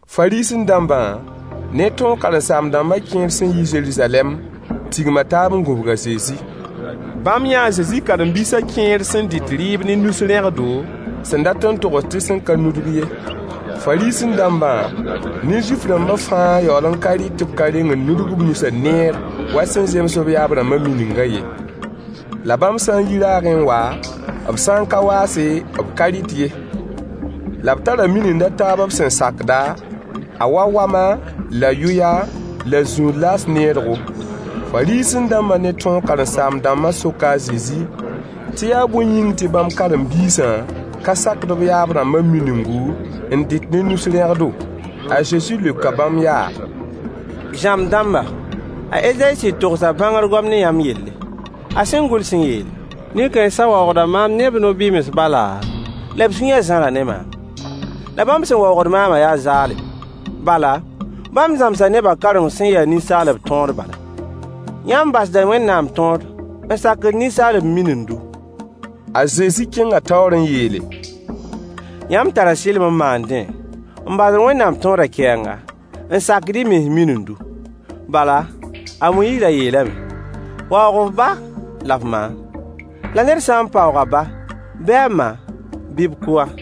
Fariisẽ-dãmbã ne tõog karen-saam-dãmbã kẽer sẽn yi Zeruzalɛm tigma taab n gũbg a Zezi. Bãmb yãa a Zezi karen-biisã kẽer sẽn dɩt rɩɩb ne nus-rẽgdo, sẽn dat n togs tɩ sẽn ka nudg ye. Fariisẽ-dãmbã ne Zuif-rãmbã fãa yaool n ka rɩt tɩ b ka reng n nudg b nusã neer wa sẽn zems b yaab-rãmbã miningã ye. La bãmb sã n yi raagẽ n wa, b sã n ka waase b ka rɩt ye. La b tara minind a taab b sẽn sakda, a wa wama la yʋya la zũud laas needgo. Fariisẽ-dãmbã ne tõog karen-saam-dãmbã soka a Zezi tɩ yaa bõe yĩng tɩ bãmb karen-biisã ka sakd b yaab-rãmbã miningu, n dɩt ne nus-rẽgdo? A Zezi leoka bãmb yaa: Zãmb-dãmba, a Ezayi sɩd togsa bãngr goam ne yãmb yelle, a sẽn gʋls n yeele: “Nin-kãensã waoogda maam ne b nobɩms bala, la b sũyã zãra ne maam. La bãmb sẽn waoogd maamã yaa zaalem, bala, bãmb zãmsa nebã kaoreng sẽn ya ninsaalb tõod bala.” Yãmb basda Wẽnnaam tõod n sakd ninsaalb minindu. A Zezi kẽnga taoor n yeele: Yãmb tara sɩlem n maandẽ n basd Wẽnnaam tõodã kɛɛnga n sakd y mens minindu. Bala, a Moyiis ra yeelame: “Waoog f ba la f ma, la ned sã n paoog a ba bɩ a ma bɩ b kʋ-a.”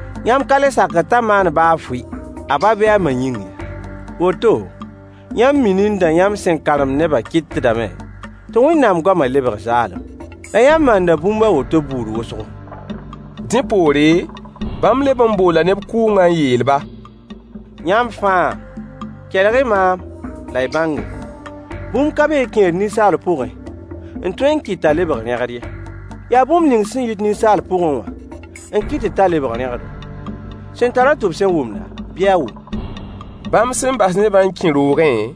Yãmb ka le sakd t'a maan baa fʋɩ a ba bɩ a ma yĩng ye. Woto, yãmb minindã yãmb sẽn karemd nebã kɩtdame tɩ Wẽnnaam goamã lebg zaalem. La yãmb maanda bũmb a woto buud wʋsgo. Dẽ poore, bãmb leb n boola neb kʋʋngã n yeel-ba: Yãmb fãa, kelg-y maam la y bãnge. Bũmb ka be n kẽed ninsaal pʋgẽ n tõe n kɩt t'a lebg rẽgd ye. Yaa bũmb ning sẽn yit ninsaal pʋgẽ wã n kɩtd t'a lebg rẽgdo. [ Sẽn tar-a tʋb sẽn wʋmda, bɩ a wʋm.] Bãmb sẽn bas nebã n kẽ roogẽ,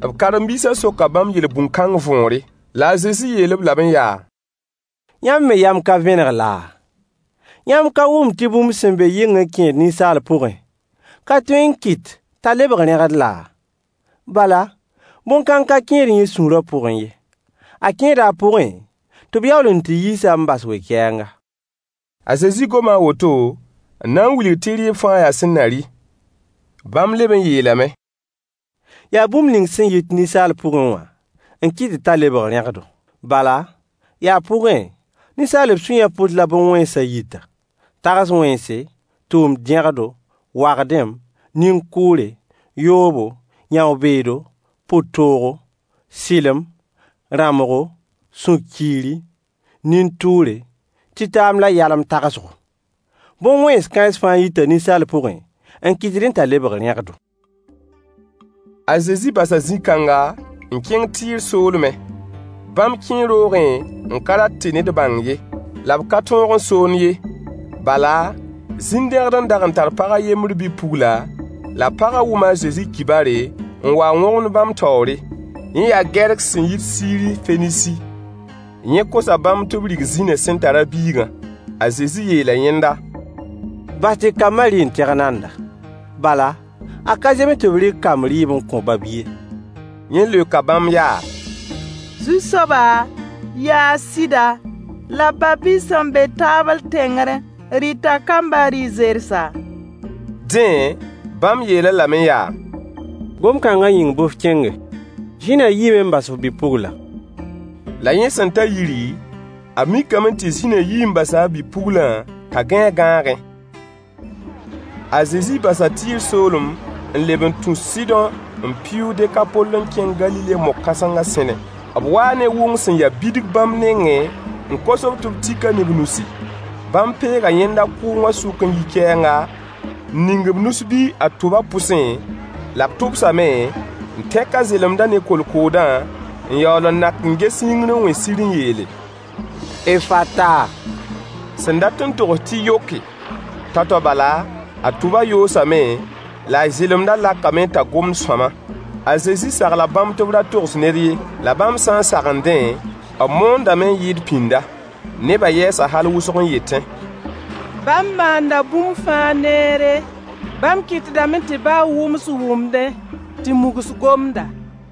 b karen-biisã soka bãmb yel-bũn kãng võore. La a Zezi yeel-b lame yaa: Yãmb me yam ka vẽneg laa? Yãmb ka wʋmd tɩ bũmb sẽn be yɩng n kẽed ninsaal pʋgẽ ka tõe n kɩt t'a lebg rẽgd laa? Bala, bõn-kãng ka kẽed yẽ sũurã pʋgẽ ye, a kẽeda a pʋgẽ tɩ b yaool n tɩ yiis-a n bas we-kɛɛnga. (A Zezi goma a woto n na n wilg tɩ rɩɩb fãa yaa sẽn na rɩ.) Bãmb leb n yeelame: Yaa bũmb ning sẽn yit ninsaal pʋgẽ wã n kɩtd t'a lebg rẽgdo. Bala, yaa pʋgẽ, ninsaalb sũyã pʋs la bõn-wẽnsã yita: tags-wẽnse, tʋʋm-dẽgdo, wagdem, nin-kʋʋre, yoobo, yão-beedo, pʋ-toogo, sɩlem, rãmbgo, sũ-kiiri, nin-tʋʋre, tɩtaam la yalem-tagsgo. Bõn-wẽn kãens fãa yita ninsaal pʋgẽ n kɩtdẽ t'a lebg rẽgdo. A Zezi basa zĩ-kãnga n kẽng Tɩɩr soolmẽ. Bãmb kẽe roogẽ n ka rat tɩ ned bãng ye, la b ka tõog n soond ye. Bala, zĩn-dẽgd n dag n tar pag a yembr bi-pugla, la pagã wʋma a Zezi kibare, n wa n wõgemd bãmb taoore. Yẽ yaa Gɛrk sẽn yit Siiri Fenisi. Yẽ kosa bãmb tɩ b rig zĩnã sẽn tar a biigã. A Zezi yeela yẽnda: Bas tɩ kambã rɩ n tɩg nanda, bala, a ka zems tɩ b rɩk kamb rɩɩb n kõ ba-bi ye. Yẽ leoka bãmb yaa: Zu-soaba, yaa sɩda, la ba-bi sẽn be taabl tẽngr rɩta kambã rɩ-zersã. Dẽ, bãmb yeel-a lame yaa: Gom-kãnga yĩng bɩ f kẽnge. Zĩnã yiime n bas f bi-puglã. La yẽ sẽn ta yiri, a mikame tɩ zĩnã yii n basa a bi-puglã t'a gãe a gãagẽ. A Zezi basa Tɩɩr soolem n leb n tũ Sɩdõ n pɩʋʋg Dekapol n kẽng Galile mog-kãsengã sẽne. B waa ne wʋng sẽn ya bidg bãmb nengẽ n kos-b tɩ b tik-a ne b nusi. Bãmb peega yẽnda kʋʋngã sʋk n yi kɛɛnga, n ning b nus-bi a tʋbã pʋsẽ, la b tʋbsame, n tẽk a zelemdã ne kolkoodã, n yaool n nak n ges yĩngr n wẽ sir n yeele: “Effata,” sẽn dat n togs tɩ yoke. Tao-tao bala, a tʋba yoosame, la a zelemdã lakame t'a gomd sõama. A Zezi sagla bãmb tɩ b ra togs ned ye. La bãmb sã n sagendẽ, b moondame n yɩɩd pĩnda. Nebã yɛɛsa hal wʋsg n yetẽ: Bãmb maanda bũmb fãa neere. Bãmb kɩtdame tɩ baa wʋms wʋmdẽ, tɩ mugs gomda.